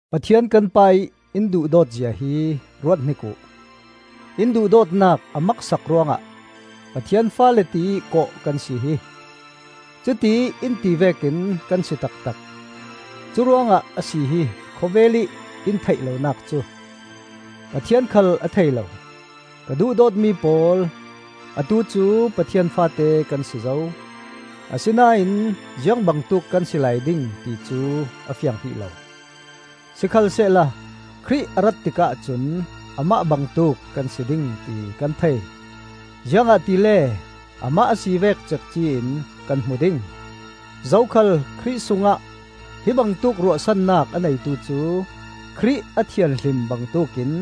Pathian kan Pa-ih in duhdawt zia hi ruathnik uh! In duhdawtnak a maksak ruangah Pathian faale tiih kawh kan si hi; cutiih in ti vekin kan si taktak. Curuangah a si hi khawvelih in theih lonak cu! Pathian khal a thei lo. Ka duhdawtmi pawl, atu cu Pathian faate kan si zo; asinain ziang bangtuk kan si lai ding ti cu a fiang hrih lo. Sikhalsehla Khrih a rat tikah cun amah bangtuk kan si ding ti kan thei; ziangahtile amah a si vek cekci in kan hmu ding. Zokhal Khrih sungah hi bangtuk ruahsannak a neitu cu Khrih a thianhlim bangtuk in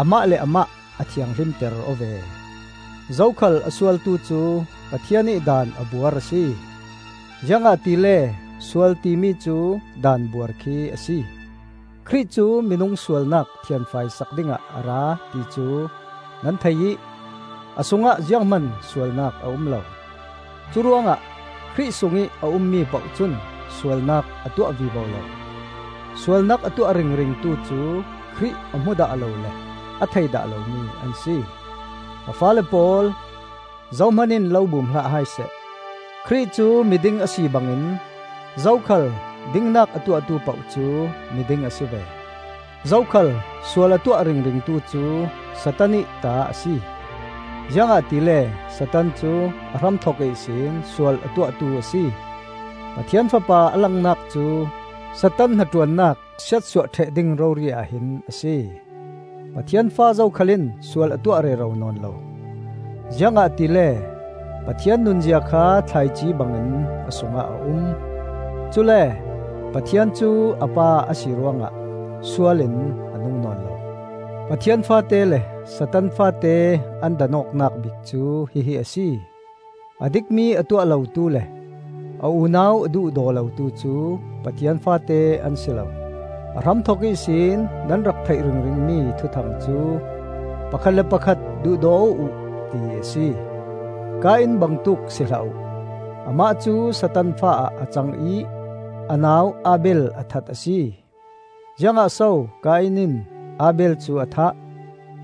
amah le amah a thianghlimter aw ve. Zokhal a sualtu cu Pathian ih daan a buar a si, ziangahtile sual timi cu daanbuar khi a si. Khrih cu minung sualnak thianfai sak dingah a ra ti cu nan thei ih a sungah ziang hman sualnak a um lo. Curuangah Khrih sungih a ummi poh cun sualnak a tuah vivo lo. Sualnak a tuah ringringtu cu Khrih a hmu dah lo le a thei dah lomi an si. Ka faale pawl, zohman in lo bum hlah hai seh. Khrih cu miding a si bangin zokhal dingnak a tuahtu poh cu miding a si ve. Zokhal sual a tuah ringringtu cu Satan ih ta a si, ziangahtile Satan cu a hramthok ihsin sual a tuahtu a si. Pathian Fapa a langnak cu Satan hnaṭuannak siatsuah ṭheh ding rori ahhin a si. Pathian fa zokhal in sual a tuah rero nawn lo, ziangahtile Pathian nunzia kha thlaici bangin a sungah a um. Cule Pathian cu a Pa a si ruangah sual in a nung nawn lo. Pathian faate le Satan faate an dan awknak bik cu hihi a si: a dikmi a tuah lotu le a unau a duhdaw lotu cu Pathian faate an si lo. A hramthok ihsin nan rak theih ringringmi thuthang cu pakhat le pakhat duhdaw aw uh, ti a si. Kain bangtuk si hlah uh; amah cu Satan fa ah a cang ih a nau Abel a that a si. Ziangah so Kain in Abel cu a thah?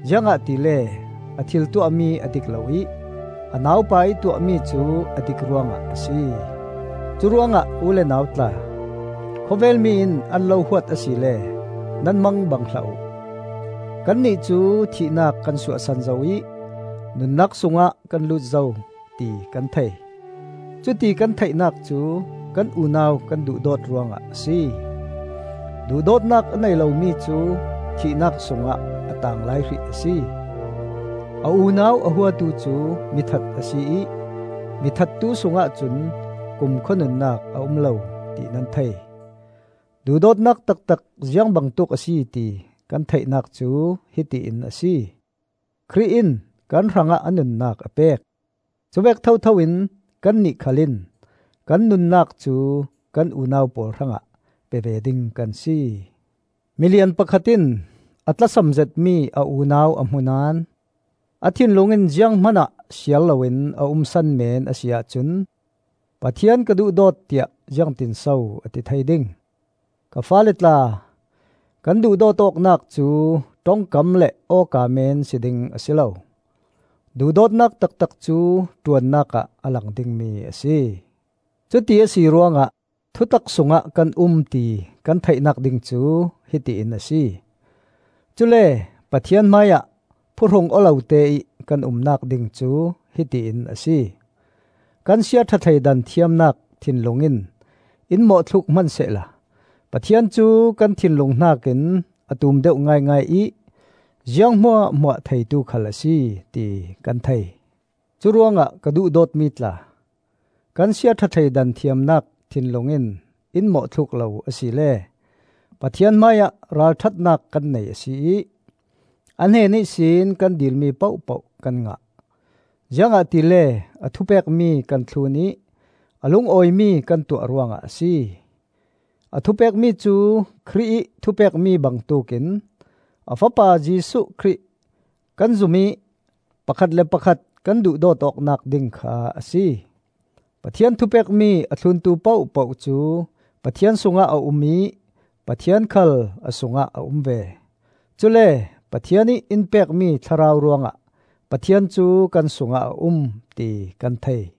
Ziangahtile a thil tuahmi a dik lo ih a naupa ih tuahmi cu a dik ruangah a si. Curuangah u le nau tla, khawvelmi in an lo huat asile nan mang bang hlah uh. Kannih cu thihnak kan suahsan zo ih nunnak sungah kan lut zo, ti kan thei; cuti kan theihnak cu kan unau kan duhdawt ruangah a si. Duhdawtnak a nei lomi cu thihnak sungah a taang lai hrih a si. A unau a huatu cu mithat a si ih mi thattu sungah cun kumkhua nunnak a um lo ti nan thei. Duhdawtnak taktak ziang bangtuk a si ti kan theihnak cu hiti in a si: Khrih in kan hrangah a nunnak a pek. Cuvek thothoin kannih khal in kan nunnak cu kan unau pawl hrangah pe ve ding kan si. Milian pakhat in a tlasam zetmi a unau a hmu naón a thinlung in ziang hmanah siar loin a umsan meen a si ahcun Pathian ka duhdawt tiah ziangtinso a ti thei ding? Ka faale tla, kan duhdawt awknak cu ṭongkam le awka men si ding a si lo; duhdawtnak taktak cu ṭuannak ah a lang dingmi a si. Cuti a si ruangah thutak sungah kan um ti kan theihnak ding cu hiti in a si; cule Pathian hmaiah phuhrung aw loteih kan umnak ding cu hiti in a si. Kan siaṭha thleidan thiamnak thinlung in in mawhthluk hman sehla Pathian cu kan thinlung hnakin a tum deuh ngaingai ih ziang hmuahhmuah theitu khal a si, ti kan thei. Curuangah ka duhdawtmi tla, kan siaṭha thleidan thiamnak thinlung in in mawhthluk lo asile Pathian hmaiah ralṭhatnak kan nei a si ih, a hnen ihsin kan dilmi pohpoh kan ngah, ziangahtile a thupekmi kan thlun ih a lungawimi kan tuah ruangah a si. A thupekmi cu Khrih ih thupekmi bangtuk in, a Fapa Jesuh Khrih kan zum ih pakhat le pakhat kan duhdawt awknak ding kha a si. Pathian thupekmi a thluntu pohpoh cu Pathian sungah a um ih Pathian khal a sungah a um ve. Cule Pathian ih in pekmi Thlarau ruangah Pathian cu kan sungah a um, ti kan thei.